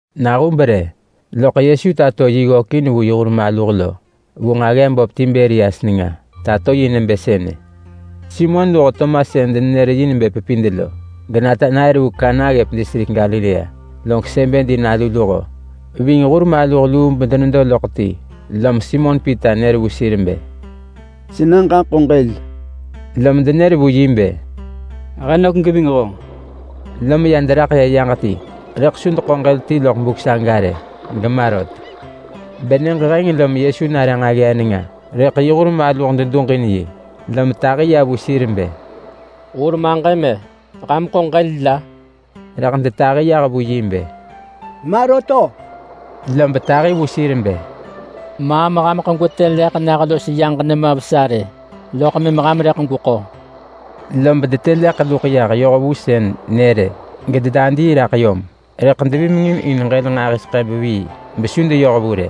Nahub rë loḳ Yesu tato yi ggökin vu yi hur maluh vu nġaggee böp Tiberias nenga. Tato yi nebë sënë: Simon luho Tomas (sën denenër yi nebë Pepid lo), geNatanael (vu Kana ggëp distrik Galilea), log Sebedi nalu luho ving hur maluh luu bedenedo loḳ ti. Lom Simon Pita nër vu sir bë, “Sena ġaḳo ġël!” Lom denër vu yi bë, “He nök geving honġ.” Lom ya deraḳ ya yaġ ti rëḳ su deḳo ġël ti loḳ buk saga rë gema rot. Benyëġ heng lom Yesu nare nġaggee nenga rëḳ yi hur maluh duġin yi. Lom tahi ya vu sir bë, “Hur maġëm-e! Ham ḳo ġël la?” Rëḳ detahi yah vu yi bë, “Ma rot-o!” Lob tahi vu sir bë, “Maam hameḳ gwetë leḳ nah los yaġ nenga vesa rë, loḳ mëm ham rëḳ gweko.” Lom detë leḳ luḳ yah yoh vu sën nër-ë gededadii raḳ yom, rëḳ devimengin in ġël nġahiseḳë vevii besu deyoh vu rë.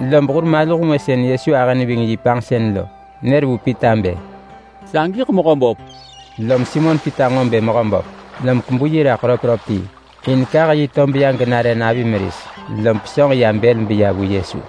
Lob hur maluh ngwë sën Yesu ahë neving panġsen lo, nër vu Pita bë, “Sagiḳ Mehöböp!” Lom Simon Pita nġo bë Mehöböp, lom kebu yi raḳ röpröp ti, in kah yi tob ya genare navi meris, lom pesönġ ya bël beya vu Yesu.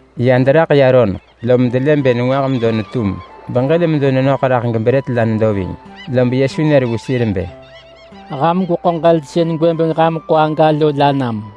Ya deraḳ ya roneḳ lom delë bë nengwah medo netum beġël medo nenöḳ raḳ gebrët la nedo ving. Lob Yesu nër vu sir bë, “Ham gweḳo ġël sën gwëbeng ham ḳo aga lo la nam.”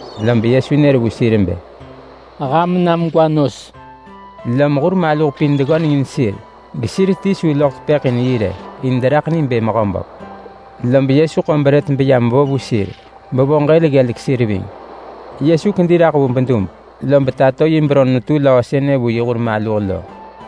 Lob Yesu nër vu sir bë, “Ham nam gwa nos!” Lom hur maluh pin deggöneng in sir gesir ti su loḳ tepëḳ in yi rë, in deraḳ ni bë Mehöböp. Lob Yesu ḳo brët beyam vo vu sir, bevo ġël ggelek sir ving. Yesu kedi raḳ vu bedub lob tato yi beron netu löö sënë vu yi hur maluh lo.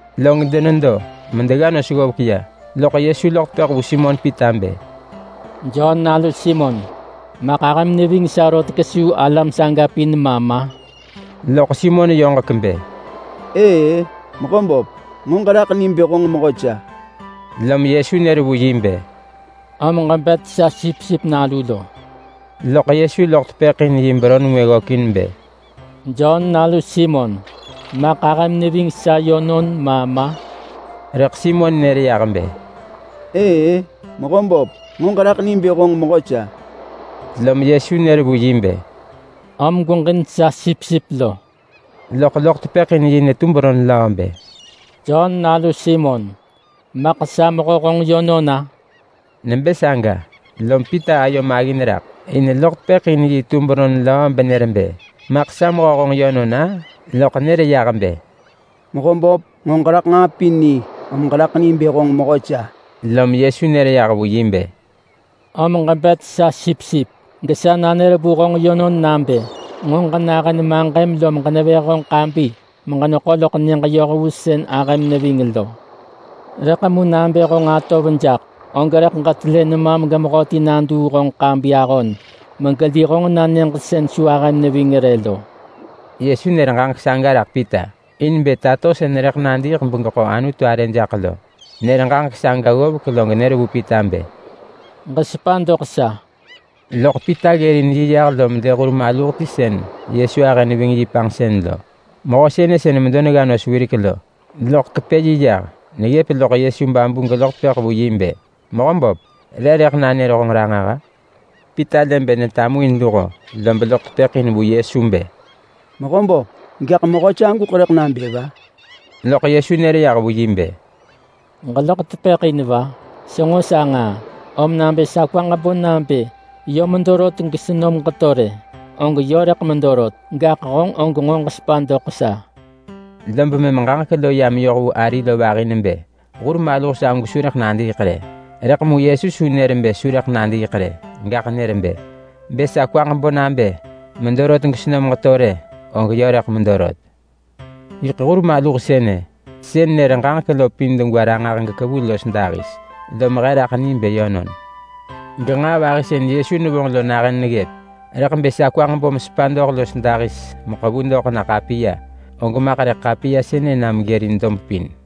Log denedo medegga nos ggovek ya, loḳ Yesu loḳ tepëḳ vu Simon Pita bë, “Jon nalu Simon, maḳ ahëm neving sa rot kesuu alam saga pin ma ma?” Loḳ Simon yoġek bë, “Ëë-ë, Mehöböp! Nġo ġeraḳ ni bë honġ mehö sa!” Lom Yesu nër vu yi bë, “Om ġebet sa sipsip nalu lo!” Loḳ Yesu loḳ tepëḳ in yi beron ngwë ggökin bë, “Jon nalu Simon, maḳ ahëm neving sa yönon ma ma?” Rëḳ Simon nër yah bë, “Ëë-ë, Mehöböp! Nġo ġeraḳ ni bë honġ mehö sa!” Lom Yesu nër vu yi bë, “Om gweġin sa sipsip lo!” Loḳ loḳ tepëḳ in yi netu beron löö bë, “Jon nalu Simon, maḳ sa mehö honġ yönon-a?” Nebë saga, lom Pita ayo maggin raḳ in loḳ tepëḳ in yi tu beron löö benër bë, “Maḳ sa mehö honġ yönon-a?”, loḳ nër yah bë, “Mehöböp, nġo ġeraḳ nġaa pin ni, om ġeraḳ ni bë honġ mehö sa!” Lom Yesu nër yah vu yi bë, “Om ġebet sa sipsip! Gesa nanër vu honġ yönon nabë nġo ġenahën maġëm lom ġenevëh honġ ḳabi meġeneḳo loḳ nyëġ yoh vu sën ahëm neving lo. Rëḳ mu nabë honġ atov jaḳ, og rëḳ ġetelë nemam gemehöti naduu honġ ḳabi ahon megeli honġ na nyëġ sën su ahëm neving rë lo.” Yesu nër ġaġek saga raḳ Pita in bë tato sën rëḳ nadiiḳ begeḳo Anutu arë jaḳ lo. Nër ġaġek saga ggovek log nër vu Pita bë, “Ġesepa doḳ sa!” Loḳ Pita ggërin yi yah lom lë hur maluh ti sën Yesu ahë neving yi panġsën lo. Mehö sënë sën medo denegga nos wirek lo, loḳ kepë yi yah neggëp loḳ Yesu babu geloḳ tepëḳ vu bë, “Mehöböp, re rëḳ nanër honġ ranġah-a?” Pita lë bë netamuin luho, lob loḳ tepëḳ in vu Yesu bë, “Mehöböp, gaḳ mehö saguḳ rëḳ nabë va?” Loḳ Yesu nër yah vu yi bë, “Ġeloḳ tepëḳ in va? Senġo sa nġaa! Om nabë sa kwaġ bo nabë yö medo rot gesenom geto rë, og yö rëḳ medo rot. Gaḳ honġ og nġo ġesepa doḳ sa!” Lob mëm ġaġek lo ya meyoh vu ari lo vahi nebë hur maluh sagu su rëḳ nadiiḳ rë. Rëḳ mu Yesu su nër bë su rëḳ nadiiḳ rë, gaḳ nër bë, “Bë sa kwaġ bo nabë medo rot gesenom geto rë, og yö rëḳ medo rot.” Yiḳ hur maluh sënë sën nër ġaġek lo pin degwa ranġah gekevu los dahis, lom he raḳ ni bë yönon. Genġaa vahi sën Yesu nevonġ lo nahën neggëp. Rëḳ bë sa kwaġ bo mesepa doḳ los dahis meḳevu doḳ na ḳapiya, og maḳ rëḳ ḳapiya sënë na megërin dob pin.